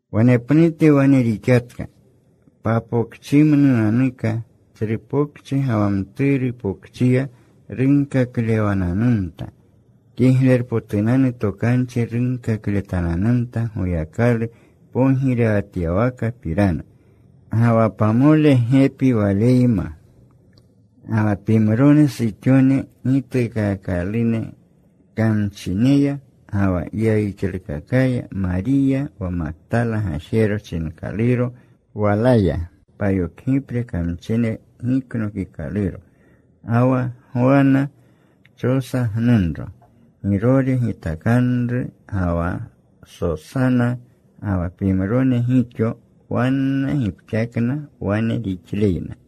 Wanepnute wane rixatka. Papokchimnunanuka, tsru pokchi ga wa mturu pokchiya runkaklewananumta. Kiglerpotunanu Tokanchi runkakletananumta Goyakalu pogirewatyawakapirana. Ga wa pamole gepi Waleyma. Ga wa pimrone suxone gituukaakalune kamchineya ga wa yayixlukakaya. Mariya wa Maktala gajero chinkaluro. Walaya payokgipre kamchine giknokikaluro. Ga wa Gwana, Chosa gnunro, Girore gitakanru, ga wa Sosana, ga wa pimrone gixo. Wanna gipxakna wane rixleyna.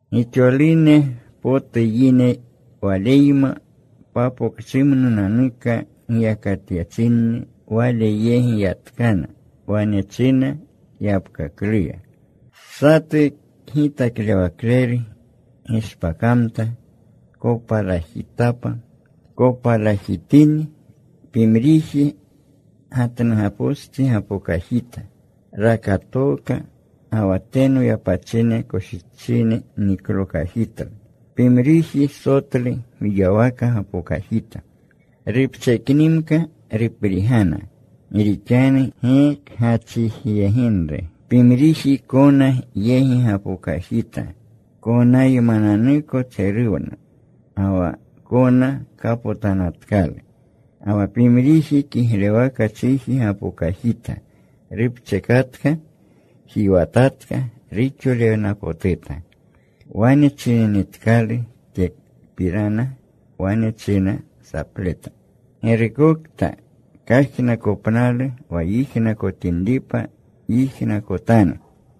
Gixolune potu yine Waleyma papokchimnunanuka giyakatyachinni. Wale yegi yatkana. Wane china yapkakluya, “Satu kgitaklewakleru gishpakamta. Kopalajtapa. Kopalajitini, pimriji gatnugapostsi gapokajita. Rakatooka. Ga wa teno yapachine koshichine niklokajitlu. Pimriji sotlu gwiywaka gapokajita. Rupcheknimka. Ruprigana gi rixanu gi kgachijiyeginru. Pimriji kona yegi gapokajita. Konaymananuko tseruwna. Ga wa kona kapotanatkalu. Ga wa pimriji kiglewaka chiji rapokajita. Rupchekatka. Jiwatatka. Ruxolewnapotuta.” Wane chininitkalu tyepirana, wane china sapleta, “¡Girukokta kajnakopnalu wa yijnakotinripa, yijnakotanu!”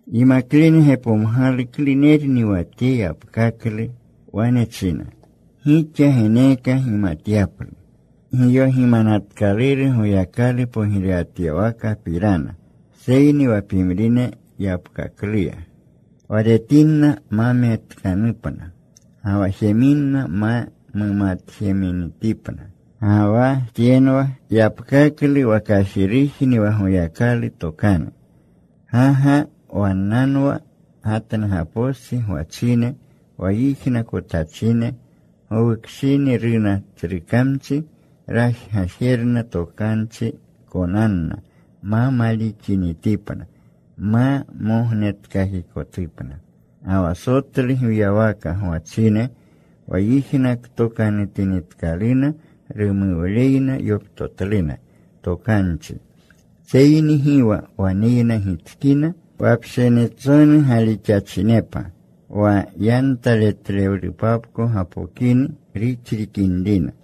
Yimaklene gepomgalu klunerni wa tye yapkaklu. Wane china, “Gixa geneeka gimatyaplu giyogimanatkaluru Goyakalu pogirewatyawakapirana. Seyni wa pimrine, yapkakluya, Wa retinna ma metkanupna. Ga wa jeminna ma mumatjeminitipna. “Ga wa tyenwa yapkaklu. Wa kajirujni wa Goyakalu tokanu. Ga ga wannanwa gatnugapostsi gwachine, wa yijnakotachine. Gowukshini runa tsru kamchi. Rajgajerna tokanchi konanna, ma malixinitipna, ma mognetkakikotupna. Ga wa sotlu gwiywaka gwachine, wa yijnaktokanutinitkaluna, rumuwleyna yoptotluna tokanchi. Seyni gi wa waneyna gitskina. Wa pshinitsonu galixachinepa, wa yantaletlewlupapko gapokini ruxrikinrina.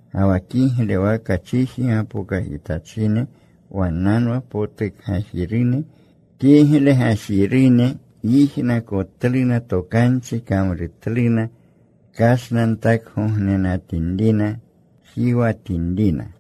Ga wa kiglewaka chiji gapokajitachine, wannanwa potukgajirune, kigle gajirune. Yijnakotluna tokanchi. Kamrutluna. Kashnantakgognenatinrina. Jiwatinrina.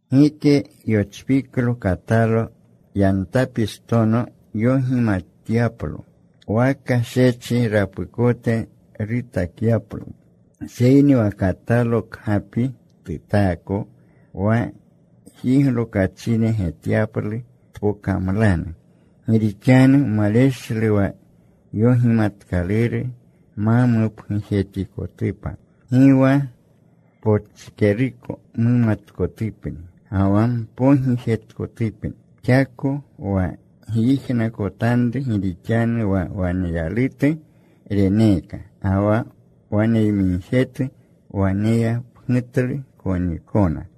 “Gike yochpiklo katalo yantapistono yogimatyaplo, waka shechi rapukote rutakyaplo. Seyni wa katalo kgapi tutaako, wa jiglokachine getyaplu tpokamlanu. Gi rixanu maleshlu wa yogimatkaluru ma mupgujetikotupa. Gi wa pochkeruko mumatkotupni ga wa mpogijetkotupni. Xakoka wa gyijnakotanru. Gi rixanu wa waneyalutu reneeka. Ga wa waneyamigjetu, waneyapgutlu konikona.”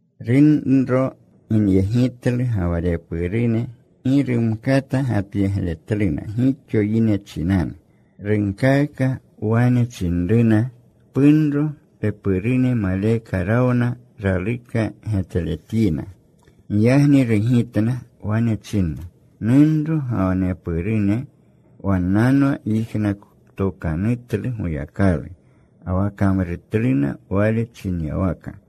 Runro ginyegitlu ga wa repurune. Gi rumkata gapyegletluna gixo yine chinanu. Runkaaka. Wane chinruna, “Punro, pepurune maleka rawna. Raluka getletyina.” Giyagni rugitna. Wane chinna, “Nunro ga wa nepurune wannanwa yijnaktokanutlu Goyakalu, ga wa kamrutluna Wale chinyawaka.”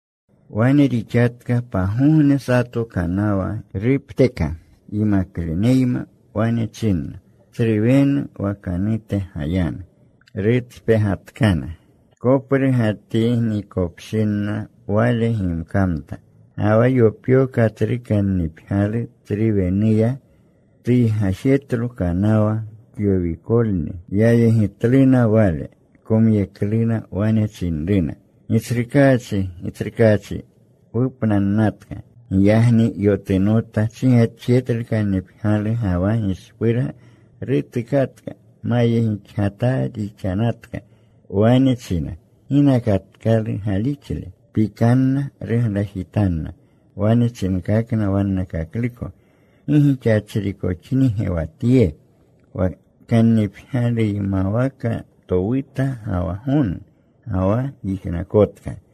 Wane rixatka pagogne. Sato kanawa rupteka yimakleneyma. Wane chinna, “Tsru wenu wakanute gayanu.” Rutspegatkana. Koprugatinikopshinna Wale gimkamta. Ga wa yopyoka tsru kannipgyalu tsru wenuya. Tuygajetlo kanawa. Kyowikolni. Yayegitluna Wale. Komyekluna. Wane chinruna, “Gitsrukaachi, Gitsrukaachi, wupnannatka.” Giyagni yotunota. Chigetjetlu kannipgyalu ga wa gishpurga. Rutukatka. Mayegixgataa rixanatka. Wane chinna, “¿Ginakatkalu galixle?” Pikanna. Ruglajitanna. Wane chinkakna wannakakluko, “¿Gi gixachrikoxnige wa Tye, wa kannipgyaluymawaka towuta ga wa gonu? Ga wa yijnakotka.”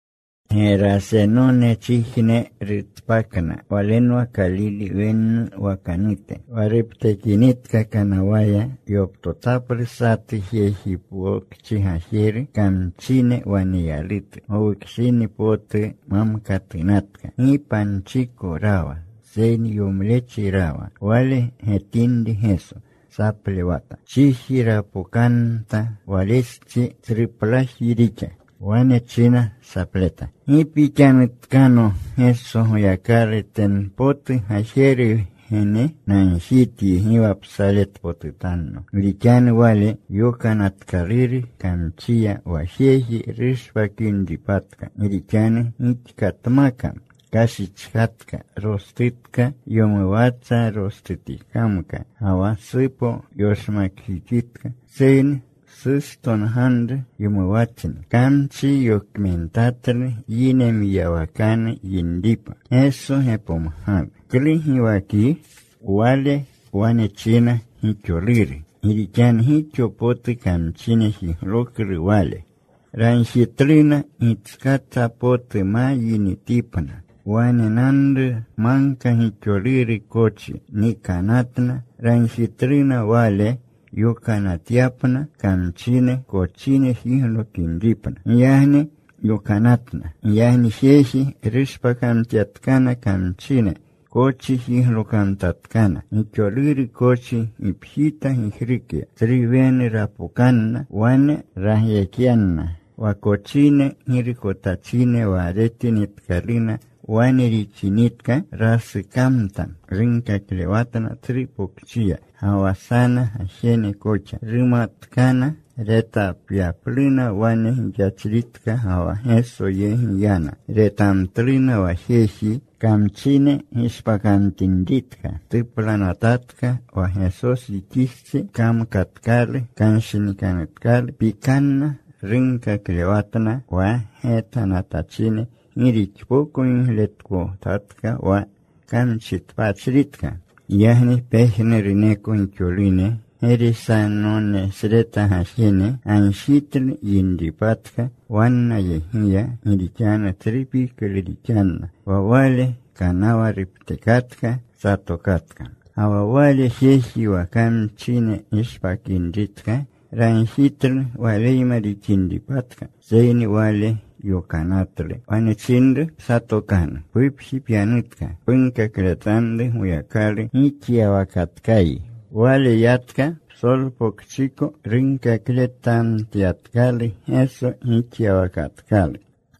Gerasenonechijne rutspakna. Walenwa Kalile wenne wakanute. Wa ruptekinitka kanawaya, yoptotaplu satu jeji pokchi gajeru, kamchine waneyalutu. Gowukshini potu mamkatunatka. Gi panchiko rawa, seyni yomlechi rawa. Wale getinri Geso, saplewata. Chiji rapokamta Walestsi. Tsruplaji rixa. Wane china saplewleta, “¿Gi pixanutkano Geso, Goyakalu teno potu Gajeru Wgene? Nagjityi gi wa psaletpotutanno.” Gi rixanu Wale yokanatatkalu kamchiya wa jeji rushpakinripatka. Gi rixanu gixkatmaka kashichkatka. Rostutka. Yowumatsa rostutikamka. Ga wa supo yoshmakjixitka. Seyni sustonganru yowumatsni. Kamchi yokmentatlu yine mwiyawakanu yinripa. Geso gepomgalu, “¿Klu giwakyi?” Wale wane china, “Gixoluru.” Gi rixanu gixo potu kamchine jigloklu wale. Ragjitluna gitskata potu ma yinitipna. Wanenanru magka gixoluru kochi. Nikanatna. Ragjitluna Wale yokanatyapna kamchine kochine jiglokinripna. Giyagni yokanatna. Giyagni jeji rushpakamtyatkana kamchine. Kochine jiglokamtatkana. Gixoluru kochi gipjita gijrukya. Tsru wenu rapokanna. Wane ragyekyanna. Wa kochine girukotachine, wa retinitkaluna wane rixinitka, rasukamtna. Runkaklewatna tsru pokchiya, ga wa sana gajene koxa. Runatkana retapyapluna wane gixachritka. Ga wa Geso yegi yana. Retamtluna wa jeji kamchine gishpakamtinritka. Tuplanatatka wa Gesojixistsi. Kamkatkalu. Kanshinikanutkalu. Pikanna. Runkaklewatna wa getanatachine gi rixpoko gigletkotatka wa kamchitpachritka. Giyagni pejnuruneko gixolune Gerasenonesreta gajene gagjitlu yinripatka wannayegiya gi rixanu tsru piklu rixanna. Wa Wale kanawa ruptekatka. Satokatka. Ga wa wale jeji wa kamchine gishpakinritka ragjitlu Waleyma rixinripatka. Seyni Wale yokanatlu. Wane chinru, “Psatokanu. Pupji pyanutka. Punkakletanru Goyakalu gixyawakatkayi.” Wale yatka. Psolpokchiko runkakletamtyatkalu Geso gixyawakatkalu.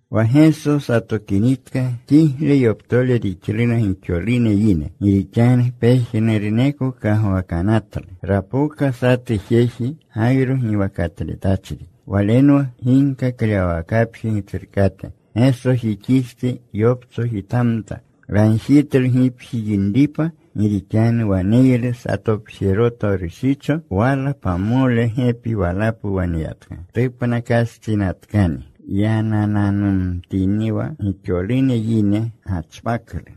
Wa Geso satokinitka kigle yoptole rixluna gixolune yine, gi rixanu pejnuruneko kagwakanatlu. Rapoka satu jeji Gayro giwakatletachri. Walenwa ginkaklewawakapji gitsrukate. Gesojixistsi yoptsojitamta. Ragjitlu gipji yinripa. Gi rixanu waneylu satopjeroto rushicho. Wala pamole gepi walapu waneyatka. Tupnakastsinatkani. Yanananumtiniwa gixolune yine gachpaklu.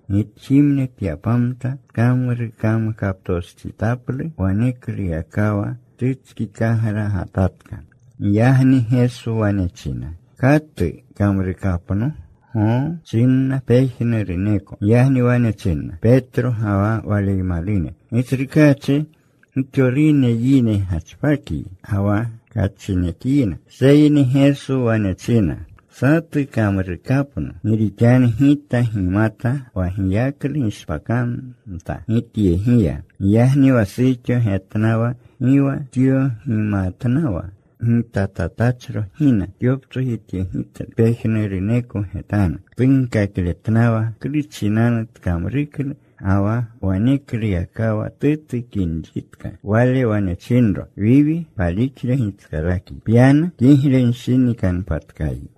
Gitjimne tyapamta. Tkamrukamkaptostsitaplu. Wanekluyakawa tutskikagragatatka. Giyagni Geso wane china, “¿Katu kamrukapno?” “Goo,” chinna pejnuruneko. Giyagni wane chinna Petro ga wa waleymalune, “Gitsrukaachi, gixolune yine gachpakyi ga wa kachinekyina.” Seyni Geso wane china, “Satu kamrukapno. Gi rixanu Gita gimata wa giyaklu gishpakamta Gityegiya.” Giyagni wa suxo getnawa gi wa tyogimatnawa, gitatachro gina. Tyoptsojityegitlu. Pejnuruneko getanu tunkakletnawa klu chinanu tkamruklu, ga wa wanekluyakawa tutukinritka. Wale wane chinro, “Wiwi, palixle gitskalakyi. Pyanu. Kiglenshinikanpatkayi.”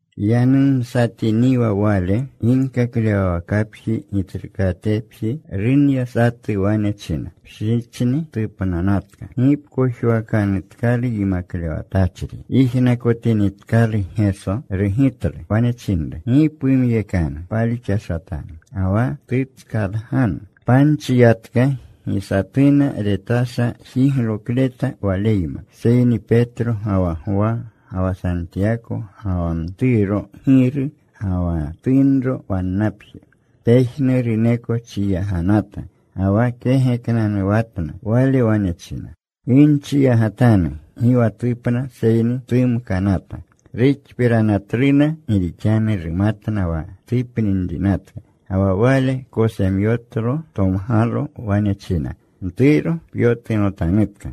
Yanumsatiniwa Wale, ginkaklewawakapji gitsrukatepji runya satu. Wane china, “Pshichni tupnanatka. Gi pkojwakanutkalu Yimaklewatachri.” Yijnakotinitkalu Geso, rugitlu. Wane chinru, “Gi pumyekanu. Palixashatanu. Ga wa tutskalganu.” Panchi yatka. Gi satuna retasha jiglokleta Waleyma, seyni Petro ga wa Gwa ga wa Santiyako, ga wa mturo giru ga wa tunro wannapje. Pejnuruneko chiyaganata, ga wa kegeknanuwatna. Wale wane china, “Gi nchiyagatanu. Gi wa tupna seyni tumkanata.” Ruxpiranatluna gi rixanu rumatna wa tupninrinatka. Ga wa Wale kosemyotlo. Tomgalo. Wane china, “Mturo, pyotunotanutka.”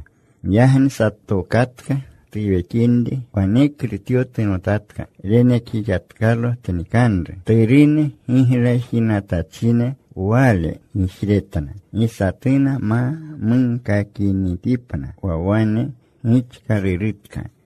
Giyagni satokatka tuwekinri. Waneklu tyotunotatka. Renekjixatkalo tnikanru. Turune giglajinatachine. Wale gijretna gi satuna ma munkakinitipna wa wane gixkalurutka.